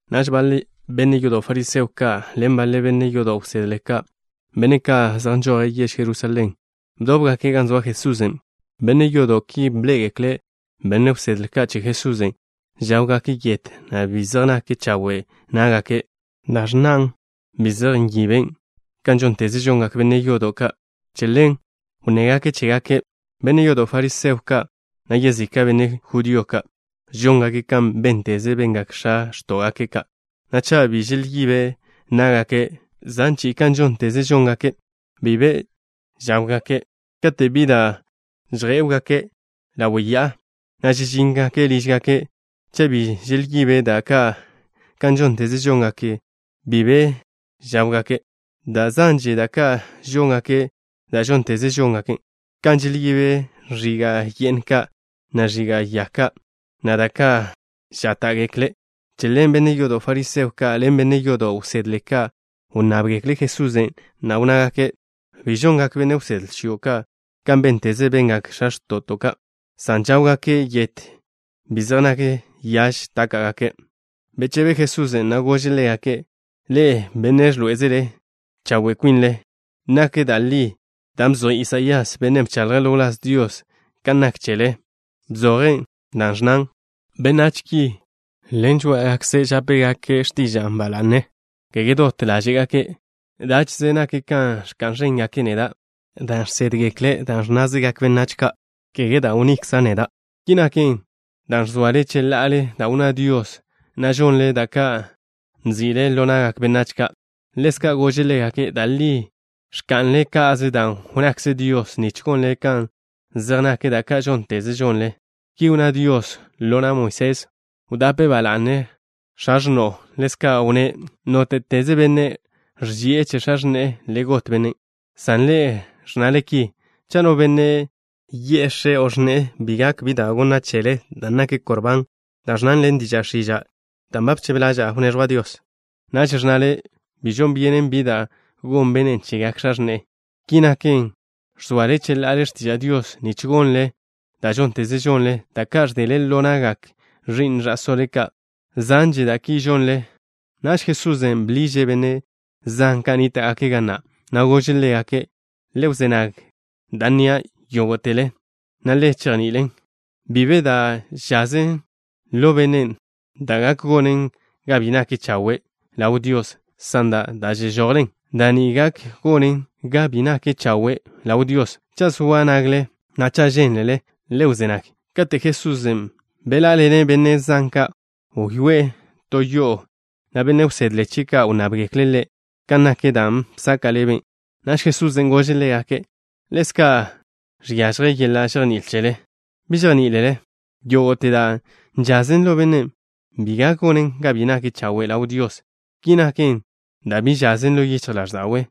Naž baḻe benne' yodo' fariseo ka' ḻen baḻe benne' yodo' wsedle ka', benne' ka' zej nžoje' yež Jerusalén, bdóbgake' gan zoa Jesusen'. Benne' yodo' ki bḻé'egekle' benne' wsedle ka' che Jesusen' žáwgake' yet, na' bi zej nak chawe' ná'gake', dan' ẕnnan: bi zej nyiben kan žónteze žongak benne' yodo' ka'. Che ḻen wnnégake' chégake'. Benne' yodo' fariseo ka', na' yezika' benne' judío ka', žóngake' kan bénteze bengak x̱a x̱tó'gake' ka', na' cha' bi želyibe' ná'gake' zan chi'i kan žónteze žóngake', bi be žáwgake'. Kate' bi da' žjé'wgake' ḻawe' ya'a, na' žežíngake' lížgake', cha' bi želyibe' da' ka' kan žónteze žóngake', bi be žáwgake'. Da' zanže da' ka' žóngake', da' žónteze žóngake', kan želyibe' ẕiga' ye'n ka', na' ẕiga' ya ka', na' da' ka' žáta'gekle'. Che ḻen benne' yodo' fariseo ka' ḻen benne' yodo' wsedle ka' wnnábgekle' Jesusen', na' wnnágake': —¿Bi žongak benne' wsedle chio' ka' kan bénteze bengak x̱a x̱to'žo ka', san žáwgake' yet, bi zej nak chawe' ná'gake'? Bechebe Jesusen', na' gože' ḻégake': —Ḻe'e, benne' ẕḻoé'ezele chawe' kwinle. Nak da' li dan' bzoj Isaías, bennen' bchaḻje' ḻo wláz Dios, kan nak chele. Bzoje' da' ẕnnan: Benách ki, ḻen žoá'agakze' žápegake' x̱tiža'a ba la'ne, kege dot ḻáže'gake'. Dáche'ze nak kan ẕka'n ẕéngake' neda' dan' žsédgekle' da' ẕnnázegak benách ka', kege da' wnnikza' neda'. Ki naken, dan' ẕzoale cheḻa'ale da' wnná Dios, na' žonle da' ka' nzi'le ḻo na'gak benách ka'. Ḻezka' gože' ḻégake': —Da' li ẕka'nle ka'ze dan' wnnakze Dios nich gonle kan zej nak da' ka' žónteze žonle. Ki wnná Dios ḻo na' Moisés: “Wdape ba la'ne x̱a x̱no'o.” Ḻezka' wnné': “Nóte'teze benne' nne zi'e che x̱a x̱ne'e, le got bennen'.” San ḻe'e ẕnnale ki: “Cha' no benne' yi'e x̱e' o x̱ne'e: bi gak bi da' wneẕjwa' chele, dan' naken Korbán” (dan' ẕnnan ḻen diža' x̱iža': dan' ba bchebe laza'a wneẕjwan' che Dios), naž ẕnnale: “Bi žon byenen bi da' gon bennen' chegak x̱a x̱ne'e.” Ki naken, ẕzoale cheḻa'ale x̱tiža' Dios nich gonle dan' žónteze žonle, da' ka' ẕdele ḻo na'gak ẕi'n ẕa'sóle ka'. Zanže da' ki žonle. Naž Jesusen' bḻiže' benne' zan ka' nníta'gake' ga na', na' gože' ḻégake': —Le wzé nag da' nnia', yógo'tele, na' le chejni'ilen. Bi be de da' žazen ḻo benne' da' gak gonen ga bi nake' chawe' ḻaw Dios, san da' žežojen ḻe', da' ni gak gonen ga bi nake' chawe' ḻaw Dios. Cha' zoa nagle, na' cha' žénlele, le wzé nag. Kate' Jesusen' beḻá'aḻene' benne' zan ka', wyoé'e to yo'o, na' benne' wsedle chie' ka' wnnábgekle' Ḻe' kan nak dan' bsaka' ḻebe'. Naž Jesusen' gože' ḻégake': —¿Ḻezka' žiažje yeḻa' žejní'il cheḻe? ¿Bi žejní'ilele? Yógo'te da' žazen ḻo benne', bi gak gonen ga bi nake' chawe' ḻaw Dios. Ki naken dan' bi žazen ḻo yichj ḻáẕda'we',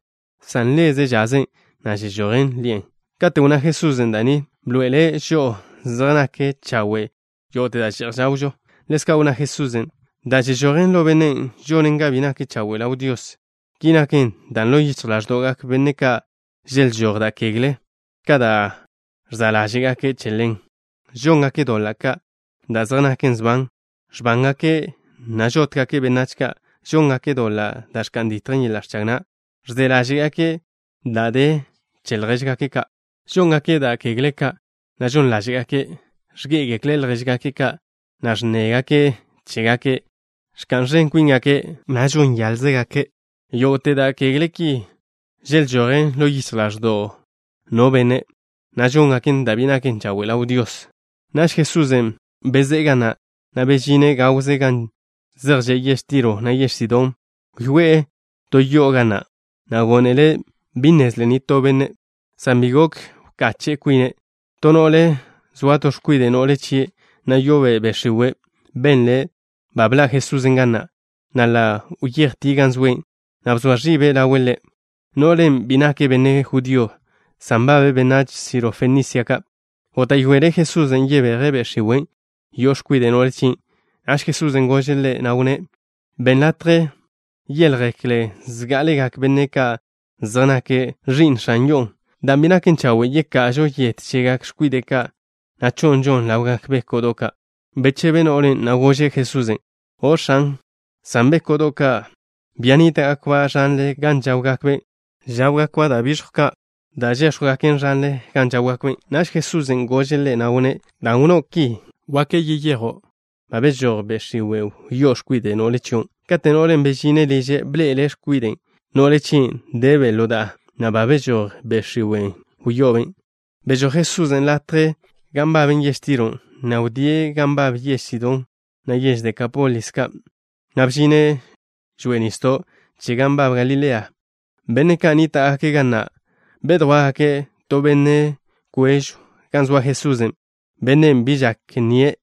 san ḻe'ze' žazen, na' žežojen ḻi'e. Kate' wnná Jesusen' da' ni, bḻoe'ele' žo'o zej nak chawe' yógo'te da' že'j žawžo. Ḻezka' wnná Jesusen': —Da' žežojen ḻo benne' žonen ga bi nake' chawe' ḻaw Dios. Ki naken, dan' ḻo yichj ḻáẕdo'gak benne' ka' želžój da' kegle ka' da' ẕza' ḻáže'gake'. Che ḻen: Žóngake' doḻa' ka' da' zej naken sban. Ẕbángake', na' žótgake' benách ka'. Žóngake' doḻa' da' ẕka'n ditjen yeḻa' ẕchag na'. Ẕze ḻáže'gake' da' de che ljéžgake' ka'. Žóngake' da' kegle ka', na' žon ḻáže'gake'. Ẕgé'egekle' ljéžgake' ka', na' ẕnnégake' chégake'. Ẕka'n ẕen kwíngake', na' žon yáḻzegake'. Yógo'te da' kegle ki želžojen ḻo yichj ḻáẕdo'w no benne', na' žóngaken ga bi nake' chawe' ḻaw Dios. Naž Jesusen' bezé'e ga na', na' bžine' gawze gan zej že' yež Tiro, na' yež Sidón. Wyoé'e to yo'o ga na', na' gónele' bi nnezlen nitó benne', san bi gok wkache' kwine'. To no'le, zoa to x̱kwide' no'le chie', na' yo'obe' be' x̱iwe', benle' ba bḻa' Jesusen' ga na', na' ḻa' wyejtie' gan zoe', na' bzoa ẕibe' ḻawe' Ḻe'. No'len' bi nake' benne' judío, san nbabe' benách Sirofenisia ka'. Góta'yoele' Jesusen' yebeje' be' x̱iwen' yo'o x̱kwide' no'le chien'. Naž Jesusen' gože' ḻe', na' wnné': —Benn latje yéḻjegekle zgá'alegak benne' ka' zej nake' ka ẕi'n x̱an yo'o, dan' bi naken chawe' yeka'žo yet chegak x̱kwide' ka', na' cho'nžon ḻawgak béko'do' ka'. Bechebe no'len', na' gože' Jesusen': —O', X̱an, san béko'do' ka', bia nníta'gakba' ẕanle gan žáwgakbe', žáwgakba' da' bižjw ka' da' žéx̱jwgaken ẕanle gan žáwgakbe'. Naž Jesusen' gože' ḻe', na' wnné': —Dan' wnnó' ki, gak yeyejo'. Ba bežój be' x̱iwen' wyó'o x̱kwide' no'le chion'. Kate' no'len' bežine' liže', bḻe'ele' x̱kwide' no'le chien', debe' ḻo da'a, na' ba bežój be' x̱iwen' wyo'obe'. Bežój Jesusen' latjen' da' nbaben yež Tiro, na' wdíe' gan nbab yež Sidón, na' yež Dekápolis ka', na' bžine' žoa'a nisdo' che gan nbab Galilea. Benne' ka' nníta'gake' ga na' bedjwá'gake' to benne' kwežw gan zoa Jesusen', benne' bi žak nnie',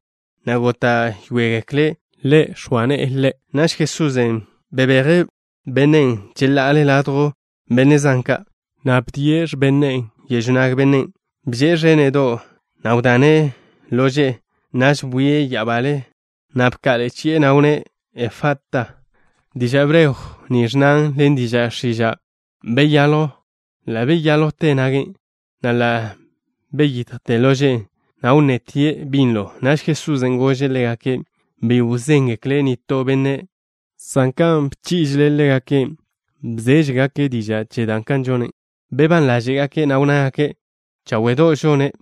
na' góta'yoegekle' Ḻe' x̱oa ne'e ḻe'. Naž Jesusen' bebeje' bennen' cheḻa'ale ladjw benne' zan ka', na' bni'e x̱ben ne'e yežw nag bennen'. Bže'e ẕéne'do', na' wdane' lože'e. Naž bwie' ya'abale, na' bka'ḻe'e chi'e, na' wnné': —Efata. Diža' hebreo ni ẕnnan ḻen diža' x̱iža': “Beyaljw.” Ḻa' beyáljwte nage', na' ḻa' beyitjte lože'e, na' wnnetie' binlo. Naž Jesusen' gože' ḻégake' bi wzéngeklen' nitó benne', san kan bchí'ižele' ḻégake', bzéžegake' diža' che dan' žone'. Bebán ḻáže'gake', na' wnnágake': —Cháwe'do' žone'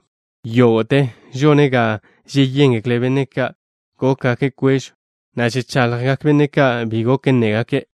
yógo'te. Žone' ga žeyéngekle benne' ka' gókgake' kwežw, na' žechaḻjgak benne' ka' bi gok nnégake'.